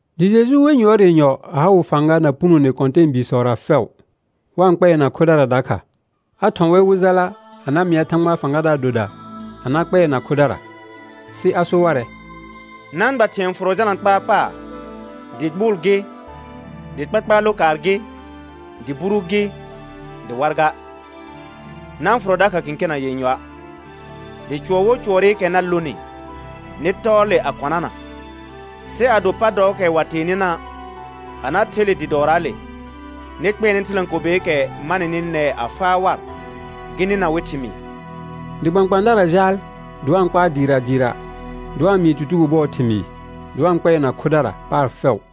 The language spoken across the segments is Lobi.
Dɩ Jeju wer yʋɔr yenyɔ a ha wɩ fãga na punone kɔ̃tɛɛbiisɔra fɛʋ, wa-n kpɛɛna khodara dakha. A thɔ̃ wɛr wɩ jala a na mɩa Thãgbaa fãgadaar doda a na kpɛɛna khodara. Sɩ a so warɛ: Na-n gba thɩ̃ɛ fʋrɔ jalna kpaar paar, dɩ gbʋʋl gɩ, dɩ kpakpaar lokaar gɩ, dɩ buru gɩ, dɩ war ga. Na-n fʋrɔ dakha kẽkena yenyɔa'. Dɩ cʋɔr wo cʋɔrɩkɛ na lonɩ, nɩ tɔɔ le a kɔnana. Sɩ ado pa dɔɔkɛ wa tee nɩna', a na the le dɩ dɔɔraale, nɩ kpɛɛnɛ thɩlãkobeekɛ ma nɩnɩ nɛɛ a faa war gɩ nɩna wɩ thɩmɩɩr. Dɩ kpãkpãadara jaal dɩ wa-n kpaar dɩɩra dɩɩra, dɩ wa-n mɩɩ tutugo bʋɔɔ thɩmɩɩ, dɩ wa-n kpɛɛna khodara paar fɛʋ.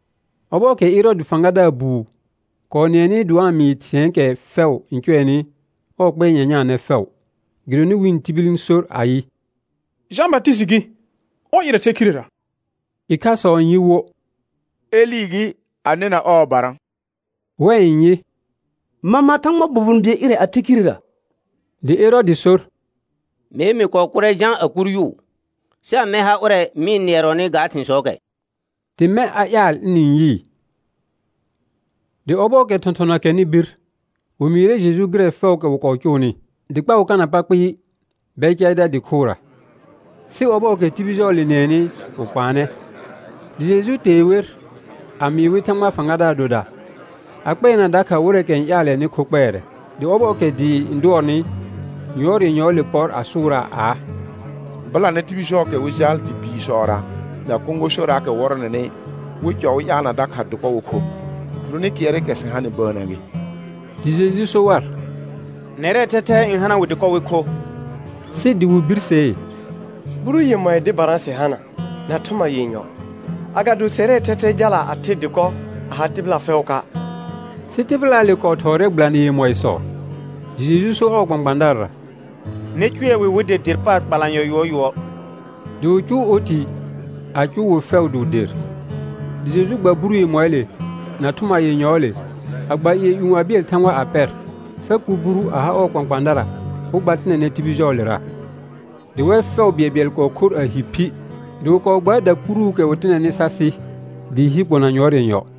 Ɔbɔɔkɛ Ɛrɔɔdɩ fãgadaar buu kɔɔ nɩɛnɩ dɩ wa-n mɩɩ thɩ̃ɛɛkɛ fɛʋ n cʋɛnɩ, ɔɔ kpɩɛr nyanyaanɛ fɛʋ, gɩdonɩ wɩ̃ tibil n sor ayɩ: Jã Batɩsɩtɩ gɩ, ɔr ɩrɛ the khirera. Ɩkhasɔ n yɩ wo: Elɩ gɩ, a nɩna ɔɔbara. Wɛ n yɩ: Mama Thãgbaa bobon bɩɛl ɩrɛ a the khirera. Dɩ Ɛrɔɔdɩ sor: Mee mɩ kɔɔ kʋrɛ Jã a kur yʋʋ, sɩ amɛ ha ʋrɛ mɩ-n nɩɛrɔnɩ ga thɩ̃sɔɔkɛ? Dɩ mɛ̃ a ƴaal ɩnɩ-n yɩɩ. Dɩ ɔbɔɔkɛ thɔ̃thɔna kɛrnɩ bir, wɩ mɩɩrɛ Jeju gɩrɛ fɛʋʋkɛ wɩ kɔɔ cʋʋnɩ. Dɩ kpa wɩ kana pa kpɩɩ Bɛcaɩda dɩ khʋra. Sɩ ɔbɔɔkɛ tibil jɔɔle nɩɛnɩ wɩ kpaanɛ. Dɩ Jeju tee wer a mɩɩ wɩ Thãgbaa fãgadaar doda, a kpɛɛna dakha wɩrɛɛkɛ n ƴaalɛnɩ kho kpɛɛrɛ. Dɩ ɔbɔɔkɛ dɩɩ n dʋɔrnɩ, yʋɔr yenyɔɔle pɔr a sʋʋraa aa: Bɩlanɛ tibil jɔɔkɛ wɩ jal dɩ biisɔra na kõgosoraakɛ wɔrɔnɛnɩ, wɩ cɔ wɩ ƴaalna dakha dɩkɔ wɩ kho, gɩdonɩ kɩɛrɩkɛ sɩ hanɩ bəənnə gɩ. Dɩ Jeju so war: Nɛrɛɛ thɛthɛ n hana wɩ dɩkɔ wɩ kho; sɩ dɩ wɩ birsee: Buru yemɔɩ dɩbara sɩ hana na thʋma yenyɔ, agado sɛrɛɛ thɛthɛ jala a the dɩkɔ a ha tɩbɩla fɛʋʋka'. Sɩ tɩbɩlaale kɔɔ thɔɔrɛ gbɩlanɩ yemɔɩsɔ. Dɩ Jeju so ɔɔ kpãkpãadarara: Nɩ cʋɛ wɩ wɩ der der paar kpalanyɔ yʋɔr yʋɔr. Dɩ wɩ cʋʋ oti a cʋʋ wɩ fɛʋ dɩ wɩ der. Dɩ Jeju gba buru yemɔɩɩle na thʋma yenyɔɔle, a gba ƴɩɛ ƴũ a bɩɛl Thãgba a pɛr, sa kuur buru a ha kpãkpãadara wɩ gba tɩnɛnɛ tibil jɔɔlera. Dɩ wɛr fɛʋ bɩɛlbɩɛl kɔɔ khor a hi phi; dɩ wɩ kɔɔ gbaar dakuruukɛ wɩ tɩnɛnɩ sa sɩ dɩɩ hi kpona yʋɔr yenyɔ.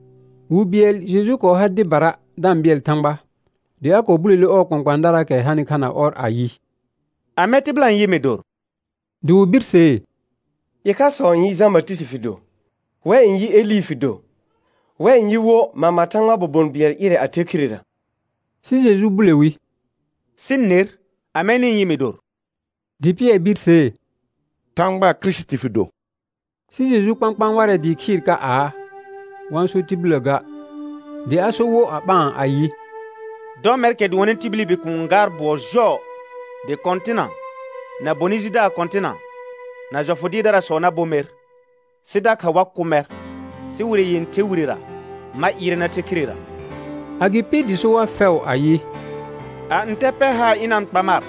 Wi bɩɛl Jeju kɔɔ har dɩbara da-n bɩɛl Thãgba, dɩ a kɔɔ bulele ɔɔ kpãkpãadaraakɛ hanɩ kha na ɔr ayɩ: Amɛ tɩbɩla n yɩ mɩ dor? Dɩ wɩ birsee: Ɩkhasɔ n yɩ Jã Batɩsɩtɩ fɩ do. Wɛ n yɩ Elɩ fɩ do. Wɛ n yɩ wo, mama Thãgbaa bobon bɩɛl ɩrɛ a the khirera. Sɩ Jeju bule wi: Sɩ ner, amɛ nɩ-n yɩ mɩ dor? Dɩ Pɩɛr birsee: Thãgbaa Kirisiti fɩ do. Sɩ Jeju kpãkpãa warɛ dɩɩ khɩɩr ka aa, wa-n so tibillə ga. Dɩ a sor wo a ɓaan ayɩ: Dɔ mɛrkɛ dʋɔnnɩ tibili Bikuun n gaar bʋɔ jɔɔ. Dɩ kɔ̃tɩna, na bonɩ jidaar kɔ̃tɩna, na jɔfʋ dɩɩrdarasɔ na bo mer, sɩ dakha wa kʋ mɛr, sɩ wire yẽther wirera ma ɩɩrɛ na the khirera. Agɩpɩ dɩ so war fɛʋ ayɩ: A ntɛ pɛr haar ɩna-n kpa mar,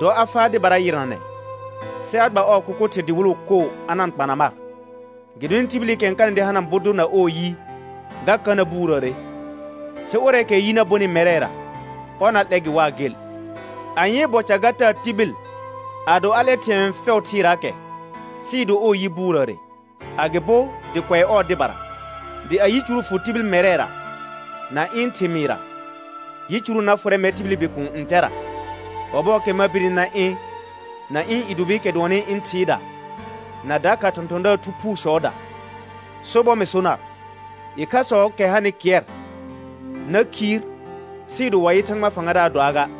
dɔ a faa dɩbara yɩrnanɛ, sɩ a gba ɔɔ kʋkʋ thɩr dɩwɩlʋ koo a na-n kpana mar. Gɩdonɩ tibilikɛ n kanɩ dɩ hana bʋ dʋr na ɔɔ yi, ga ka na buurəəre. Sɩ ʋrɛɛkɛɛ yi na bonɩ mɛrɛra, ɔr na 'lɛ gɩ waa gel. Anyee bɔ ca ga taa tibil, ado a 'lɛ thɩ̃ɛ fɛʋ thɩɩraakɛ sɩɩ do ɔɔ yi buurəəre, agɩbo dɩ kʋɛ ɔɔ dɩbara? Dɩ a yicuru fʋ tibil mɛrɛra na ɩ̃ thɩmɩɩra, yicuru na fʋrɛ mɛr tibili Bikuun ntɛra, ɔbɔɔkɛ ma birni na ɩ̃ na ɩ̃ i dʋbɩɩkɛ dʋɔnnɩ ɩ̃ Thɩɩda na dakha thɔ̃thɔ̃daar thu phuusɔɔda. Sobɔr mɩ so nar, ɩkhasɔɔkɛ hanɩ kɩɛr na khiir sɩɩ do wa yɩ Thãgbaa fãgadaar doaa ga.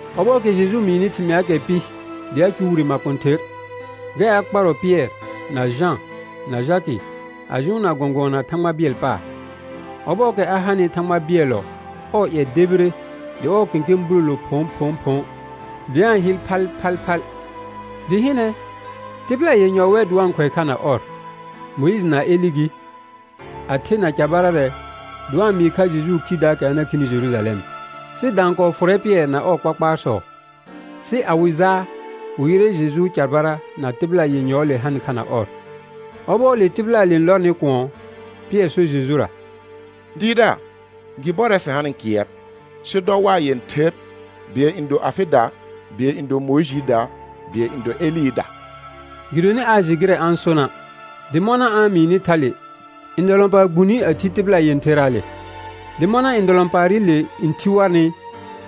Ɔbɔɔkɛ Jeju mɩɩnɩ thɩmɩaakɛ pɩ dɩ a cʋʋ wire makõther, gɛr a kparɔ Pɩɛr na Jã na Jakɩ a jʋʋnna gɔ̃gʋɔna Thãgba bɩɛl paar. Ɔbɔɔkɛ a hanɩ Thãgba bɩɛllɔ, ɔɔ ƴɛ debire dɩ ɔɔ kẽkẽ bulolo phõphõphõ dɩ a-n hɩl phalphalphal. Dɩ hɩnɛ, tɩbɩla yenyɔ wɛ dɩ wa-n khʋɛ kha na ɔr. Mʋɩjɩ na Elɩ gɩ, a the na carbararɛ, dɩ wa-n mɩɩ kha Jejuu khidaakɛ a na khini Jerujalɛm. Sɩ daan kɔɔ fʋrɛ Pɩɛr na ɔɔ kpakpaarsɔ. Sɩ a wɩ jaa, wɩ yɩrɛ Jejuu carbara na tɩbɩla yenyɔɔle hanɩ kha na ɔr. Ɔbɔɔle tɩbɩlaale n lɔrnɩ kʋɔn, Pɩɛr sor Jejura: Dɩɩrdaar, gɩ bɔrɛ sɩ hanɩ kɩɛr. Sɩ dɔ waa yẽther, bɩɛl n do afɩda, bɩɛl n do Mʋɩjɩɩda, bɩɛl n do Elɩɩda. Gɩdonɩ aa jɩ gɩrɛ a-n sona'. Dɩ mɔna a-n mɩɩnɩ thale, ndɔlɔ̃paar gbune a thi tɩbɩla yẽtheraale. Dɩ mɔna ndɔlɔ̃paarɩle n thi warnɩ,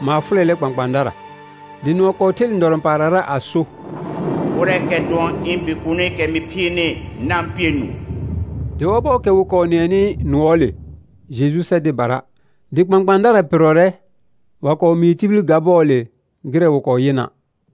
maar fʋlɛlɛ kpãkpãadara. Dɩ nʋɔ kɔɔ ther ndɔlɔ̃paarrara a so: Ʋrɛɛkɛ dʋɔn ɩ̃ Bikuunikɛ mɩ phiirni. Na-n pɩɛ nũu. Dɩ ɔbɔɔkɛ wɩ kɔɔ nɩɛnɩ nʋɔɔle, Jeju sɛ dɩbara. Dɩ kpãkpãadara pɩrrɔrɛ, wa kɔɔ mɩɩ tibil ga bɔɔle gɩrɛ wɩ kɔɔ yɩna'.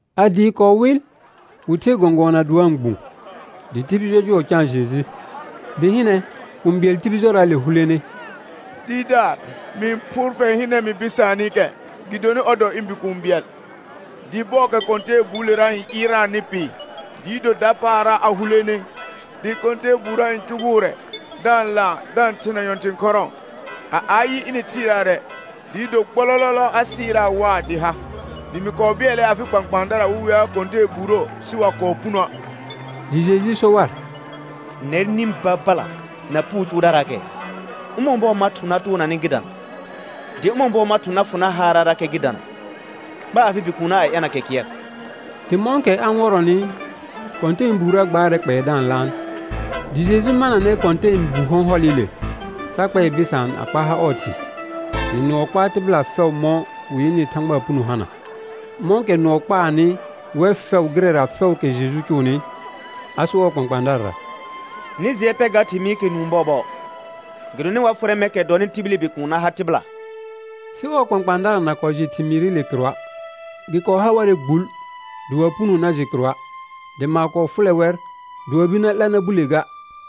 A dɩɩ kɔɔ wɩl wɩ ther gɔ̃gʋɔna dɩ wa-n gbũ, dɩ tibil jɔjʋɔ caan Jeju. Dɩ hɩnɛ, kũu bɩɛl tibil jɔraale hulene: Dɩɩrdaar, mɩ-n phʋʋr fɛr hɩnɛ mɩ bɩsaanɩkɛ, gɩdonɩ ɔr dɔ ɩ̃ bikũu bɩɛl. Dɩ bɔɔkɛ kɔ̃tɛɛbuulera ɩɩrnaanɩ pɩ, dɩɩ do dapaara a hulene, dɩ kɔ̃tɛɛbuurə n cʋgʋʋrɛ da-n laan da-n thena nyɔ̃thɩ̃ khɔrɔ̃ɔ. A ayɩ, ɩnɩ-n thɩɩraarɛ kɩɛr dɩɩ do gbɔlɔlɔlɔ a sɩraa waa dɩ ha. Dɩ mɩ kɔɔ bɩɛlɛ afɩ kpãkpãadara wɩ wea kɔ̃tɛɛbuurə, sɩ wa kɔɔ punoə'. Dɩ Jeju so war: Nɛr nĩ babala na puu cʋʋdaraakɛɛ, ʋmɔ̃ bɔɔ ma thʋ̃ na toona nɩ gɩ dana? Dɩ ʋmɔ̃ bɔɔ ma thʋ̃ na fʋ nar haarrarakɛ gɩ dana? Kpa afɩ bikuunna a ɛna kɛ kɩɛr. Dɩ mɔ̃kɛ a-n wɔrɔnɩ, kɔ̃tɛɛbuurə gbaarɛ kpɛɛ da-n laan. Dɩ Jeju mananɛ kɔ̃tɛɛbu hɔ̃hɔlɩle, sa kpɛɛ bɩsaan a kpa ha ɔɔ thɩ. Dɩ nʋɔ kpaa tɩbɩla fɛʋ mɔ̃ wɩ yɩnɩ Thãgbaa puno hana. Mɔ̃kɛ nʋɔ kpaanɩ wɛr fɛʋ gɩrɛra fɛʋʋkɛ Jeju cʋʋnɩ, a sor ɔɔ kpãkpãadarara: Nɩ jɩɛ pɛ ga thɩmɩɩkɛ nũu bɔɔbɔɔ, gɩdonɩ wa fʋrɛ mɛrkɛ dɔnɩ tibili Bikuun na ha tɩbɩla. Sɩ ɔɔ kpãkpãadara na kɔɔ jɩ thɩmɩɩrɩle kɩrʋa'. Gɩ kɔɔ ha warɛ gbul dɩ wa-n puno na jɩ kɩrʋa', dɩ maar kɔɔ fʋlɛ wɛr dɩ wa bir 'la na bule ga.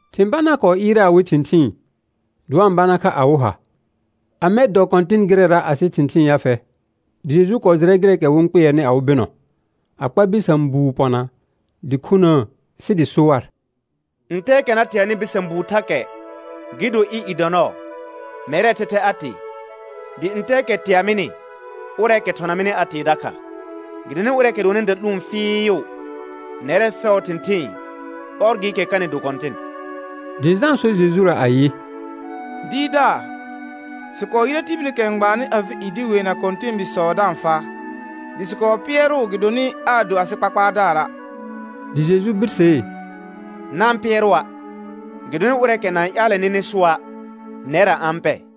Thɩ̃ banaa kɔɔ ɩɩrɛ awɩ thɩ̃thɩɩn, dɩ wa-n bana kha awɩ ha: Amɛ dɔ kɔ̃tɩn gɩrɛra asɩ thɩ̃thɩɩn ya fɛ? Dɩ Jeju kɔɔ jɩrɛ gɩrɛɛkɛ wɩ-n kpɩɛrnɩ awɩ bɩnɔ, a kpa bɩsã buu pɔna dɩ khunəə sɩ dɩ so war: Ntɛɛkɛ na teanɩ bɩsã buu thakɛ gɩ do ɩ̃ i dɔ nɔɔ, mɛrɛɛ thɛthɛ a tee, dɩ ntɛɛkɛ tea mɩnɩ, ʋrɛɛkɛ thɔna mɩnɩ a tee dakha. Gɩdonɩ ʋrɛɛkɛ dʋɔnnɩ da'lũu fɩɩʋ nɛrɛ fɛʋʋ thɩ̃thɩɩn, ɔr gɩɩkɛ kanɩ do kɔ̃tɩn. Dɩ Jã so Jejura ayɩ: Dɩɩrdaar, sɩ kɔɔ yɩrɛ tibilikɛ n gbaannɩ afɩ i dɩ weena kɔ̃tɛɛbiisɔ da-n faa, dɩ sɩ kɔɔ pɩɛrʋʋ gɩdonɩ aa do asɩ kpakpaardaara'. Dɩ Jeju birsee: Na-n pɩɛrʋa', gɩdonɩ ʋrɛɛkɛ na-n ƴaalɛ nɩnɩ sʋa', nɛrra a-n pɛ.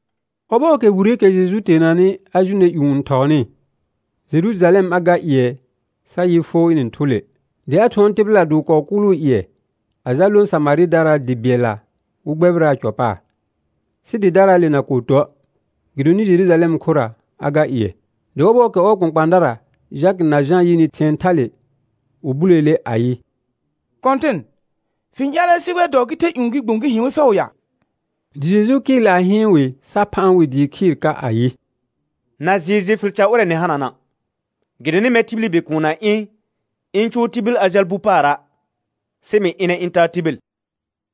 Ɔbɔɔkɛ wireekɛ Jeju teenanɩ a jʋnɛ ƴũ n thɔɔnɩ, Jerujalɛm a ga ƴɩɛ sa yɩ foo ɩnɩ-n thʋ le. Dɩ a thʋɔn tɩbɩla, dɩ wɩ kɔɔ kʋʋlʋʋ ƴɩɛ a jal lõ Samarɩdaraa dɩ bɩɛlla wɩ gbɛbɩraa cɔ paar. Sɩ dɩdaraale na kɔɔ tuə', gɩdonɩ Jerujalɛm khʋra a ga ƴɩɛ. Dɩ ɔbɔɔkɛ ɔɔ kpãkpãadara Jakɩ na Jã yɩnɩ thɩ̃ɛ thale, wɩ buleele ayɩ: Kɔ̃tɩn, fɩ-n ƴaalɛ sɩ wɛ dɔɔ gɩ the ƴũ gɩ gbũ gɩ hɩ̃ wɩ fɛʋ ya? Dɩ Jeju kɩɩl a hɩɩn wɩ sa phaan wɩ dɩɩ khɩɩr ka [ayɩ: Na jɩɩ jɩ fɩl ca ʋrɛ nɩ hanana'; gɩdonɩ mɛr tibili Bikuun na ɩ̃ ɩ̃ cʋʋ tibil a jal bu paara', sɩ mɩ ɩnɛ ɩ̃ taa tibil.]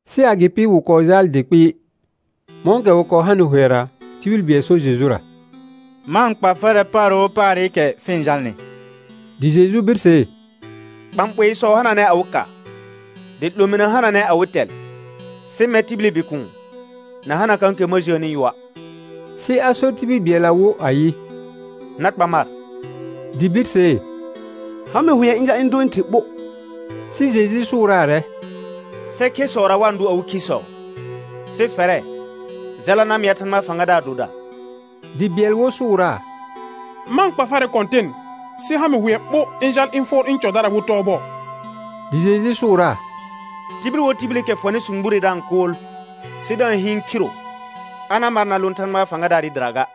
Sɩ agɩpɩ wɩ kɔɔ jaal dɩ kpɩɩ. Mɔ̃kɛ wɩ kɔɔ hanɩ hʋɛra, tibil bɩɛl sor Jejura: Ma-n kpa farɛ paar wo paarɩkɛ fɩ-n jalnɩ. Dɩ Jeju birsee: Bãɓoisɔ hananɛ awɩ ka, dɩ 'lominə hananɛ awɩ tɛl, sɩ mɛr tibili Bikuun na hana kãkɛ ma jəəni yʋa'. Sɩ a sor tibil bɩɛlla wo ayɩ: Na kpa mar. Dɩ birsee: Ha mɩ hʋɛ ɩ̃ jal ɩ̃ dʋ ɩ̃ thɩ ɓo. Sɩ Jeju sʋʋraarɛ: Sɛ khesɔra wa-n dʋ awɩ khisɔ, sɩ fɛrɛ jala na mɩa Thãgbaa fãgadaar doda. Dɩ bɩɛl wo sʋʋraa: Ma-n kpa farɛ Kɔ̃tɩn, sɩ ha mɩ hʋɛ ɓo ɩ jal ɩ̃ fʋɔr ɩ̃ cɔdara wɩ tɔɔ bɔɔ. Dɩ Jeju sʋʋraa: Tibil wo tibilikɛ fɔnɩ sũgbure da-n kʋʋl sɩ da-n hɩɩn khiro, a na mar na lõ Thãgba fãgadaarɩ dɩra ga.